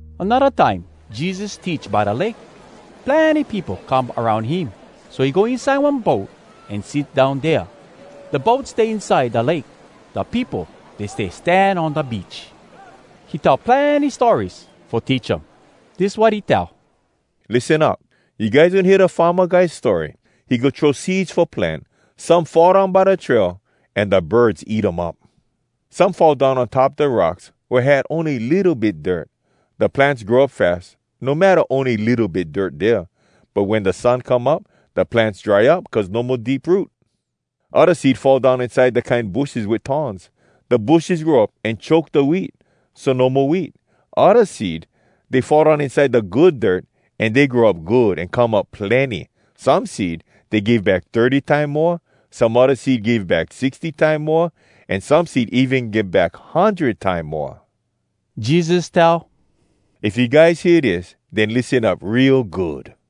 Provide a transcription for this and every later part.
Anodda time Jesus teach by da lake. Plenny peopo come aroun him, so he go inside one boat, an sit down dea. Da boat stay inside da lake. Da peopo, dey stay stan on da beach. He tell plenny stories fo teach um. Dis wat he tell: “Lissen up! You guys wen hear da farma guy story? He go throw seeds fo plant. Some fall down by da trail, an da birds eat um up. Some fall down on top da rocks wea had ony litto bit dirt. Da plants grow up fas, no matta ony litto bit dirt dea. But wen da sun come up, da plants dry up cuz no mo deep root. Odda seed fall down inside da kine bushes wit thorns. Da bushes grow up, an choke da wheat, so no mo wheat. Odda seed, dey fall down inside da good dirt, an dey grow up good, an come up plenny. Some seed, dey give back thirty time moa, some odda seed give back sixty time moa, an some seed even give back hundred time moa.” Jesus tell, “If you guys hear dis, den lissen up real good!”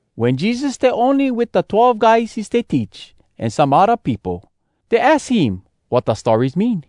Wen Jesus stay ony wit da twelve guys he stay teach an some odda peopo, dey aks him wat da stories mean.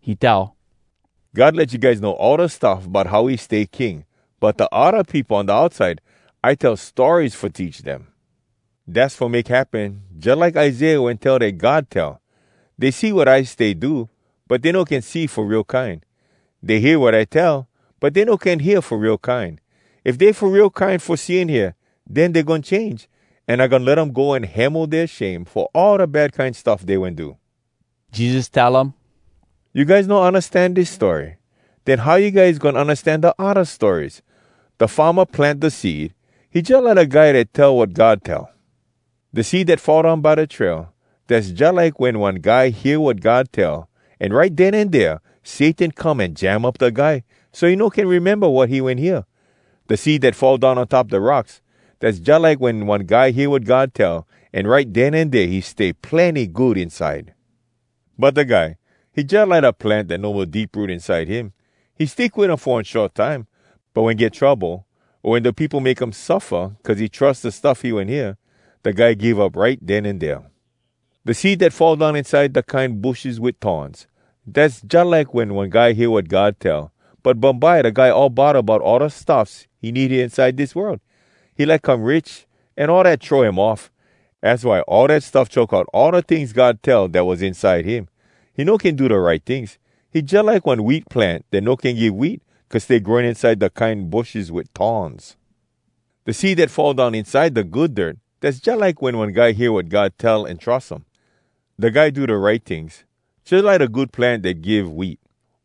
He tell, “God let you guys know all da stuff bout how he stay King. But da odda peopo on da outside, I tell stories fo teach dem. “Dass fo make happen jalike Isaiah wen tell dat God tell, “‘Dey see wat I stay do, but dey no can see fo real kine. Dey hear wat I tell, but dey no can hear fo real kine. If dey fo real kine fo see an hear, Den dey goin change, An I goin let um go an hemo dea shame Fo all da bad kine stuff dey wen do.’” Jesus tell um, “You guys no undastan dis story? Den how you guys goin undastan da odda stories? “Da farma plant da seed. He jalike da guy dat tell wat God tell. “Da seed dat fall down by da trail, dass jalike wen one guy hear wat God tell, an right den an dea Satan come an jam up da guy so he no can rememba wat he wen hear. “Da seed dat fall down on top da rocks, dass jalike wen one guy hear wat God tell, an right den an dea he stay plenny good inside. But da guy, he jalike da plant dat no mo deep root inside him. He stick wit um fo one short time. But wen get trouble, o wen da peopo make him suffa cuz he trus da stuff he wen hear, da guy give up right den an dea. “Da seed dat fall down inside da kine bushes wit thorns, dass jalike wen one guy hear wat God tell, but bumbye da guy all bodda bout all da stuffs he need hea inside dis world. He like come rich, an all dat throw him off. Az why all dat stuff choke out all da tings God tell dat was inside him. He no can do da right tings. He jalike one wheat plant dat no can give wheat, cuz stay growing inside da kine bushes wit thorns. “Da seed dat fall down inside da good dirt, dass jalike wen one guy hear wat God tell an trus um. Da guy do da right tings, jalike da good plant dat give wheat.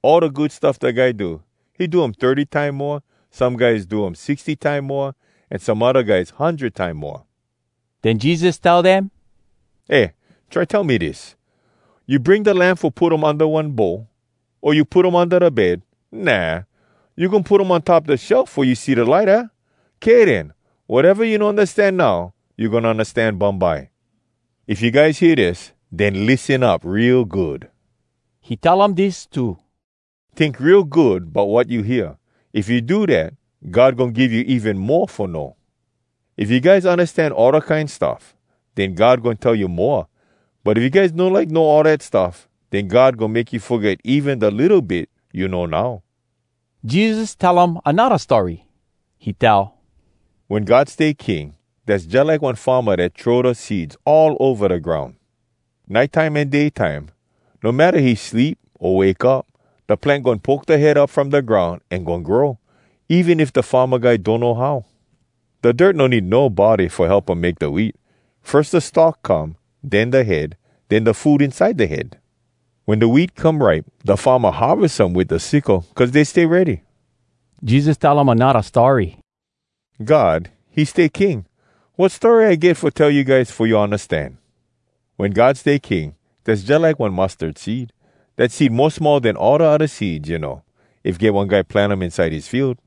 All da good stuff da guy do, he do um thirty time moa, some guys do um sixty time moa, an some odda guys hundred time moa.” Den Jesus tell dem, “Eh, try tell me dis. You bring da lamp fo put um unda one bowl? O you put um unda da bed? Nah! You goin put um on top da shelf fo you see da light, aah? Kay den, wateva you no undastan now, you goin undastan bumbye. If you guys hear dis, den lissen up real good!” He tell um dis too: “Tink real good bout wat you hear. If you do dat, God goin give you even mo fo know. If you guys undastan all da kine stuff, den God goin tell you moa. But if you guys no like know all dat stuff, den God goin make you foget even da litto bit you know now.” Jesus tell um anodda story. He tell: “Wen God stay king, dass jalike one farma dat throw da seeds all ova da groun. Nite time an day time, no matta he sleep o wake up, da plant goin poke da head up from da groun an goin grow, even if da farma guy donno how. Da dirt no need nobody fo help um make da wheat. Firs da stalk come, den da head, den da food inside da head. Wen da wheat come ripe, da farma harves um wit da sickle, cuz dey stay ready.” Jesus tell um anodda story. “God, he stay King. Wat story I get fo tell you guys fo you undastan? Wen God stay king, dass jalike one mustard seed. Dat seed mo small den all da odda seeds, you know. If get one guy plant um inside his field,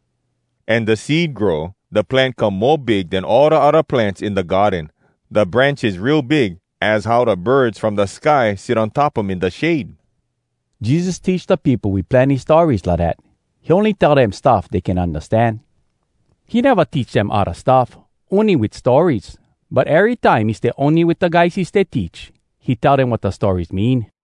an da seed grow, da plant come mo big den all da odda plants in da garden. Da branches real big, az how da birds from da sky sit on top um in da shade!” Jesus teach da peopo wit plenny stories lidat. He ony tell dem stuff dey can undastan. He neva teach dem odda stuff, ony wit stories. But erytime he stay ony wit da guys he stay teach, he tell dem wat da stories mean.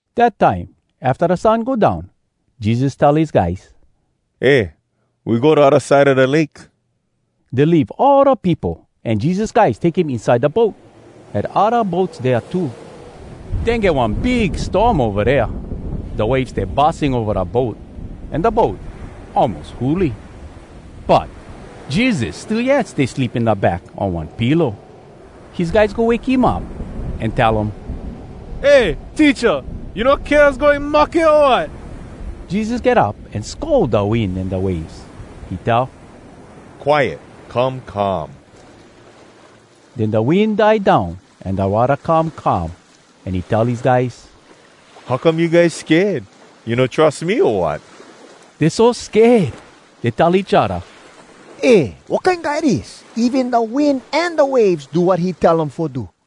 Dat time afta da sun go down, Jesus tell his guys, “Eh, we go da odda side a da lake.” Dey leave all da peopo, an Jesus guys take him inside da boat. Had odda boats dea too. Den get one big storm ova dea. Da waves stay bussing ova da boat an da boat almos huli. But Jesus still yet stay sleep in da back on one pillow. His guys go wake him up, an tell um, “Eh, Teacha! You no kea us goin mahke, o wat?” Jesus get up, an scold da wind an da waves. He tell, “Quiet! Come calm!” Den da wind die down an da watta come calm. An he tell his guys, “How come you guys sked? You guys no trus me, o wat?” Dey so sked, dey tell each odda, “Eh, wat kine guy dis? Even da wind an da waves do wat he tell um fo do!”